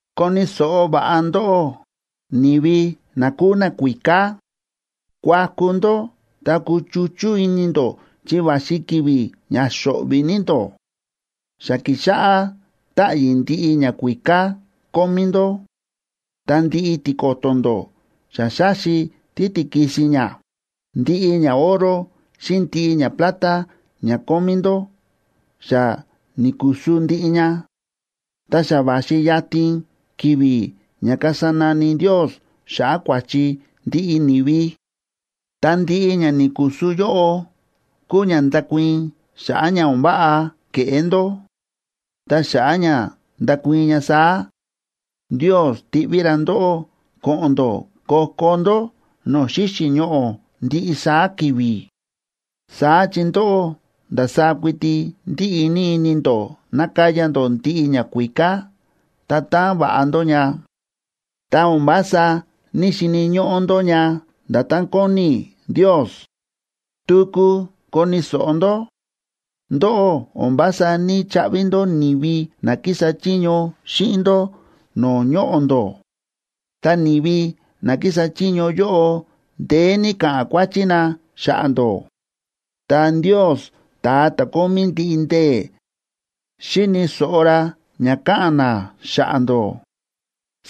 Koni̱ so̱ꞌo va̱ꞌa ndóꞌó, ni̱vi na kúu nakuíká. Kuaku ndó ta kuchuchú ini ndó chi va̱xi ki̱vi̱ ña xo̱ꞌvi̱ ní ndó. Xa kíxáꞌá táꞌyi̱ ndiꞌi ñakuíká kómí ndó, ta ndiꞌi tiko̱to̱ ndó xa xáxi títikisin ña. Ndiꞌi ñaoro xíꞌin ndiꞌi ñaplata ña kómí ndó xa ni̱kusu ndiꞌi ña. Ta xa va̱xi yatin ki̱vi̱ ña kasa nani Ndios xa̱ꞌa̱ kua̱chi ndiꞌi ni̱vi, ta ndiꞌi ña ni̱kusu yóꞌo kúu ña ndakuii̱n xa̱ꞌa̱ ña o̱n váꞌa ke̱ꞌé ndó. Ta xa̱ꞌa̱ ña ndakuii̱n ña saá, Ndios tiꞌví ra ndóꞌó ko̱ꞌo̱n ndó ko̱ko̱ ndó no̱o̱ xíxi̱ ñoꞌo̱ ndiꞌi saá ki̱vi̱. Saá chi ndóꞌó ndasaá kuiti ndíꞌi ní ini ndó nakaya ndó ndiꞌi ñakuíká ta taan va̱ꞌa ndó ña, ta o̱n vása ní‑xini̱ ñóꞌó ndó ña nda̱tán kóni Ndios. Tuku koni̱ so̱ꞌo ndó. Ndóꞌó o̱n vása ní‑chaꞌvi ndó ni̱vi na kísa chiño xíꞌin ndó no̱o̱ ñoꞌo̱ ndó, ta ni̱vi na kísa chiño yóꞌo ndeé ní káꞌa̱n kuáchí na xa̱ꞌa̱ ndó. Ta Ndios, ta̱a ta̱ kómí ndiꞌi ndee̱, xíni̱ so̱ꞌo ra ña káꞌa̱n na xa̱ꞌa̱ ndó.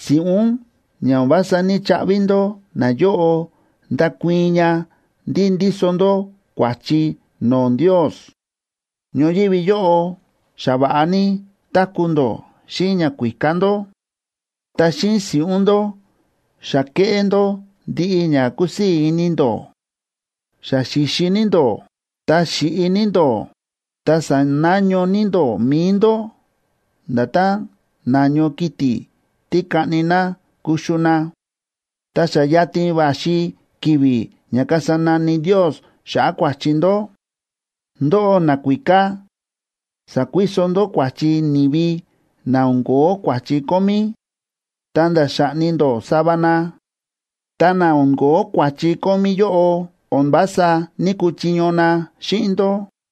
Si̱ꞌún ña o̱n vása ní‑chaꞌvi ndó nayóꞌo ndákuii̱n ña ndí ndíso ndó kua̱chi no̱o̱ Ndios. Ñoyívi yóꞌo xa va̱ꞌa ní táku̱ ndó xíꞌin ñakuíká ndó, ta xíꞌin si̱ꞌún ndó xa kéꞌé ndó ndiꞌi ña kúsii̱ ini ndó. Xa xi̱xi ní ndó, ta xi̱ꞌi ní ndó ta sa̱naño ní ndó mi̱i ndó nda̱tán na̱ño kiti̱ tí kaꞌni na kuxu na, ta xa yatin va̱xi ki̱vi̱ ña kasa nani Ndios xa̱ꞌa̱ kua̱chi ndó. Ndóꞌó nakuíká sa̱kuiso ndó kua̱chi ni̱vi na o̱n ko̱ó kua̱chi kómí, ta̱nda̱ xa̱ꞌni ndó sava na, ta na o̱n ko̱ó kua̱chi kómí yóꞌo o̱n vása ní‑kuchiño na xíꞌin ndó.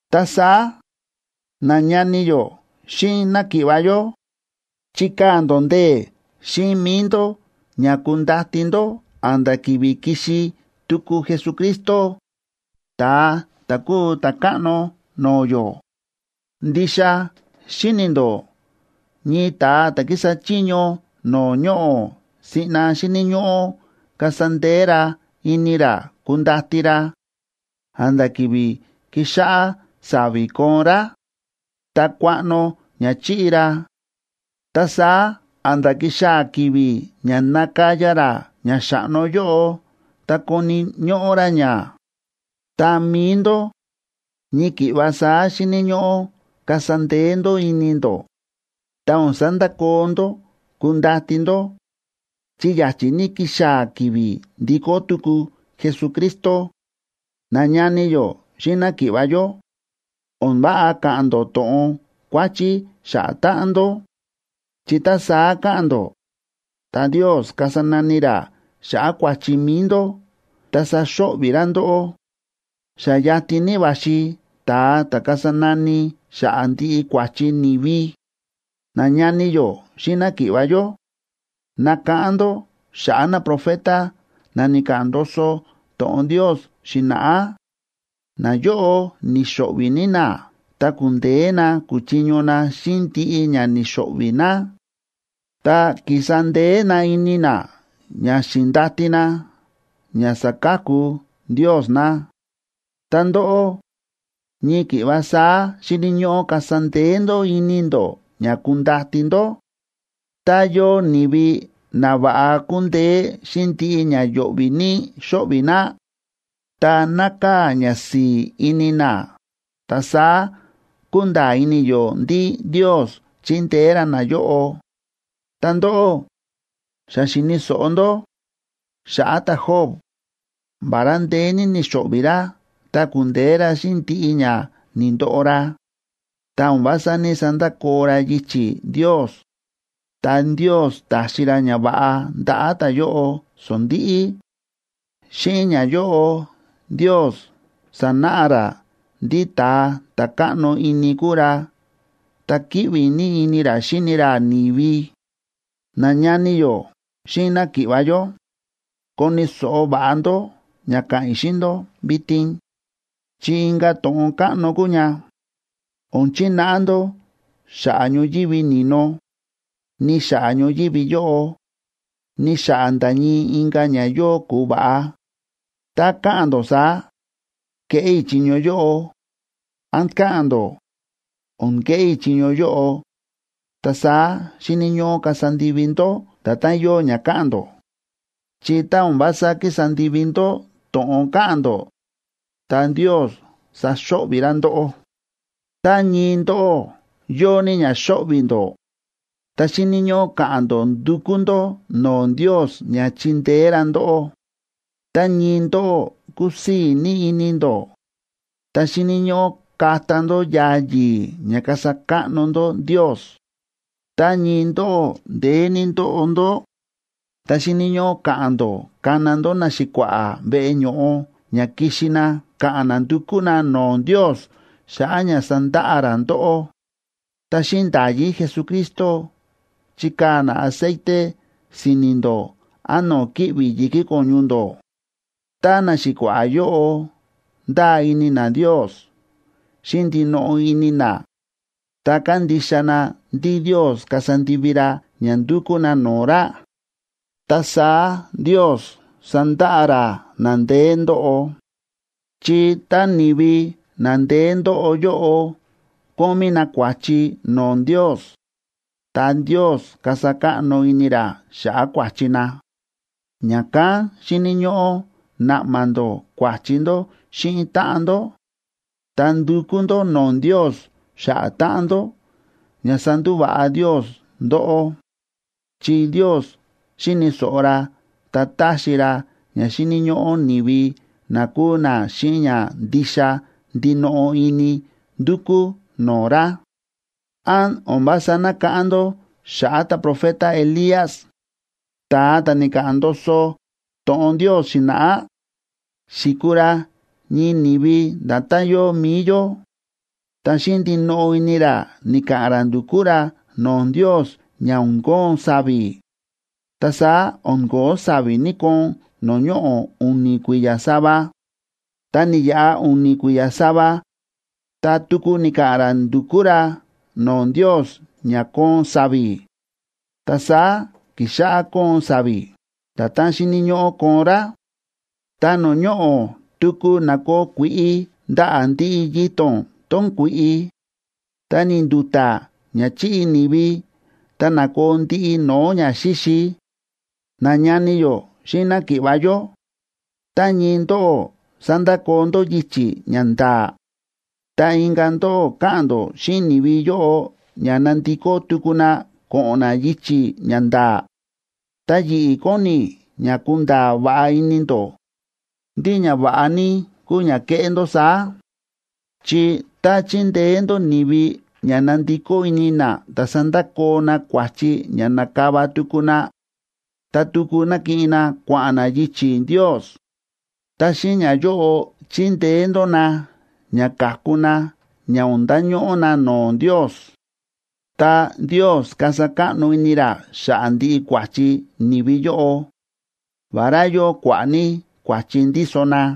Ta saá, nañani yó xíꞌin náki̱ꞌva̱ yó, chikaa̱ ndó ndee̱ xíꞌin mi̱i ndó ña kundati ndó a̱nda̱ ki̱vi̱ kixi tuku Jesucristo, ta̱a ta̱ kúu Ta̱káꞌno no̱o̱ yó. Ndixa xíni̱ ndó ñii ta̱a ta̱ kísa chiño no̱o̱ ñoꞌo̱ siꞌna xíni̱ ñóꞌó kasa ndee̱ ra ini ra kundati ra a̱nda̱ ki̱vi̱ kixáꞌá sa̱vi̱ koon rá, ta kuaꞌno ña chi̱ꞌi ra, ta saá a̱nda̱ kixaa̱ ki̱vi̱ ña nakaya ra ña xa̱ꞌno yóꞌo ta koni̱ ñóꞌó ra ña. Ta mi̱i ndó, ñii ki̱ꞌva saá xíni̱ ñóꞌó kasa ndee̱ ndó ini ndó, ta o̱n sandakoo ndó kundati ndó, chi ya̱chi̱ ní kixaa̱ ki̱vi̱ ndikó tuku Jesucristo. Nañani yó xíꞌin náki̱ꞌva̱ yó, o̱n váꞌa ka̱ꞌa̱n ndó to̱ꞌon kuáchí xa̱ꞌa̱ táꞌan ndó, chi tá saá ka̱ꞌa̱n ndó, ta Ndios kasa nani ra xa̱ꞌa̱ kua̱chi mi̱i ndó ta saxo̱ꞌvi̱ ra ndóꞌó. Xa yatin ní va̱xi ta̱a ta̱ kasa nani xa̱ꞌa̱ ndiꞌi kua̱chi ni̱vi. Nañani yó xíꞌin náki̱ꞌva̱ yó, nakáꞌán ndó xa̱ꞌa̱ naprofeta na ni̱ka̱ꞌa̱n ndoso to̱ꞌon Ndios xi̱na̱ꞌá. Nayóꞌo ni̱xo̱ꞌvi̱ ní na ta ku̱ndeé na ku̱chiño na xíꞌin ndiꞌi ña ni̱xo̱ꞌvi̱ na. Ta ki̱sa ndee̱ na ini na ña xi̱ndati na ña saka̱ku Ndios na. Ta ndóꞌó, ñii ki̱ꞌva saá xíni̱ ñóꞌó kasa ndee̱ ndó ini ndó ña kundati ndó. Tá yóo ni̱vi na va̱ꞌa kúndeé xíꞌin ndiꞌi ña yo̱ꞌvi̱ ní xóꞌvi̱ na, ta nákaa̱ ñasi̱i̱ ini na, ta saá kúnda̱a̱ ini yó ndí Ndios chíndeé ra nayóꞌo. Ta ndóꞌó xa xi̱ni̱ so̱ꞌo ndó xa̱ꞌa̱ ta̱Job. Vará ndeé ní ni̱xo̱ꞌvi̱ ra ta ku̱ndeé ra xíꞌin ndiꞌi ña ni̱ndoꞌo ra, ta o̱n vása ní‑sandakoo ra yichi̱ Ndios, ta Ndios ta̱xi ra ñava̱ꞌa ndaꞌa̱ ta̱yóꞌo sondi̱ꞌi. Xíꞌin ñayóꞌo Ndios sa̱náꞌa ra ndí ta̱a ta̱ káꞌno ini kúu ra ta kíꞌvi ní ini ra xíni ra ni̱vi. Nañani yó xíꞌin náki̱ꞌva̱ yó, koni̱ so̱ꞌo va̱ꞌa ndó ña káꞌa̱n i̱ xíꞌin ndó vitin, chi inka̱ to̱ꞌon káꞌno kúu ña. O̱n chináꞌa ndó xa̱ꞌa̱ ñoyívi ni̱no, ni xa̱ꞌa̱ ñoyívi yóꞌo, ni xa̱ꞌa̱ nda̱ ñii inka̱ ña yóo ku̱va̱ꞌa. Tá ka̱ꞌa̱n ndó saá: “Keꞌé i̱ chiño yóꞌo”, án ka̱ꞌa̱n ndó: “O̱n keꞌé i̱ chiño yóꞌo”, ta saá xíni̱ ñóꞌó kasa ndivi ndó nda̱tán yóo ña káꞌa̱n ndó. Chi tá o̱n vása kísa ndivi ndó to̱ꞌon káꞌa̱n ndó, ta Ndios saxo̱ꞌvi̱ ra ndóꞌó. Tá ñii ndóꞌó yóo ní ña xóꞌvi̱ ndó, ta xíni̱ ñóꞌó ka̱ꞌa̱n ndó ndukú ndó no̱o̱ Ndios ña chindeé ra ndóꞌó. Tá ñii ndóꞌó kúsii̱ ní ini ndó, ta xíni̱ ñóꞌó kata ndó yaa yi̱i̱ ña kasa káꞌno ndó Ndios. Tá ñii ndóꞌó ndeé ní ndóꞌo ndó, ta xíni̱ ñóꞌó ka̱ꞌa̱n ndó kana ndó naxi̱kua̱ꞌa̱ veꞌe ño̱ꞌo ña kixi na ka̱ꞌa̱n na ndukú na no̱o̱ Ndios xa̱ꞌa̱ ña sandaꞌa ra ndóꞌó, ta xíꞌin nda̱yí Jesucristo chikaa̱ na aceite si̱ni̱ ndó án no̱o̱ kíꞌvi̱ yi̱kí ko̱ñu ndó. Tá naxi̱kua̱ꞌa̱ yóꞌo ndáa ini na Ndios xíꞌin ndinoꞌo ini na, ta kándixa na ndí Ndios kasa ndivi ra ña ndúkú na no̱o̱ ra, ta saá Ndios sandaꞌa ra na ndeé ndóꞌo. Chi tá ni̱vi na ndeé ndóꞌo yóꞌo kómí na kua̱chi no̱o̱ Ndios, ta Ndios kasa káꞌno ini ra xa̱ꞌa̱ kua̱chi na. Ña̱kán xíni̱ ñóꞌó naꞌma ndó kua̱chi ndó xíꞌin táꞌan ndó, ta ndukú ndó no̱o̱ Ndios xa̱ꞌa̱ táꞌan ndó ña sandúva̱ꞌa Ndios ndóꞌó. Chi Ndios xíni̱ so̱ꞌo ra ta táxi ra ña xíni̱ ñóꞌó ni̱vi na kúu na xíꞌin ña ndixa ndinoꞌo ini ndukú no̱o̱ ra. ¿Án o̱n vása nákáꞌán ndó xa̱ꞌa̱ ta̱profeta Elías?, ta̱a ta̱ ni̱ka̱ꞌa̱n ndoso to̱ꞌon Ndios xi̱na̱ꞌá. Xi̱kuu ra ñii ni̱vi nda̱tán yóo mi̱i yó. Ta xíꞌin ndinoꞌo ini ra ni̱ka̱ꞌa̱n ra ndu̱kú ra no̱o̱ Ndios ña o̱n koon sa̱vi̱, ta saá o̱n ko̱ó sa̱vi̱ ni̱‑koon no̱o̱ ñoꞌo̱ u̱ni̱ kui̱ya̱ sava. Ta ni̱yaꞌa u̱ni̱ kui̱ya̱ sava, ta tuku ni̱ka̱ꞌa̱n ra ndu̱kú ra no̱o̱ Ndios ña koon sa̱vi̱, ta saá ki̱xáꞌá koon sa̱vi̱ nda̱tán xíni̱ ñóꞌó koon rá, ta no̱o̱ ñoꞌo̱ tuku na̱koo kui̱ꞌi ndaꞌa̱ ndiꞌi yito̱n tón kui̱ꞌi, ta ni̱ndu̱ta̱ ña chi̱ꞌi ni̱vi ta na̱koo ndiꞌi no̱o̱ ñaxíxi. Nañani yó xíꞌin náki̱ꞌva̱ yó, tá ñii ndóꞌó sa̱ndakoo ndó yichi̱ ña nda̱a̱, ta inka̱ ndóꞌó káꞌa̱n ndó xíꞌin ni̱vi yóꞌo ña nandikó tuku na ko̱ꞌo̱n na yichi̱ ña nda̱a̱, ta yi̱ꞌi̱ kóni i̱ ña kunda̱a̱ va̱ꞌa ini ndó ndí ña va̱ꞌa ní kúu ña keꞌé ndó saá. Chi tá chindeé ndó ni̱vi ña nandikó ini na ta sandakoo na kua̱chi ña na̱kava tuku na, ta tuku nakiꞌin na kua̱ꞌa̱n na yichi̱ Ndios, ta xíꞌin ñayóꞌo chindeé ndó na ña ka̱ku na ña o̱n ndañóꞌó na no̱o̱ Ndios. Ta Ndios kasa káꞌno ini ra xa̱ꞌa̱ ndiꞌi kua̱chi ni̱vi yóꞌo, vará yóo kua̱ꞌa̱ ní kua̱chi ndíso na.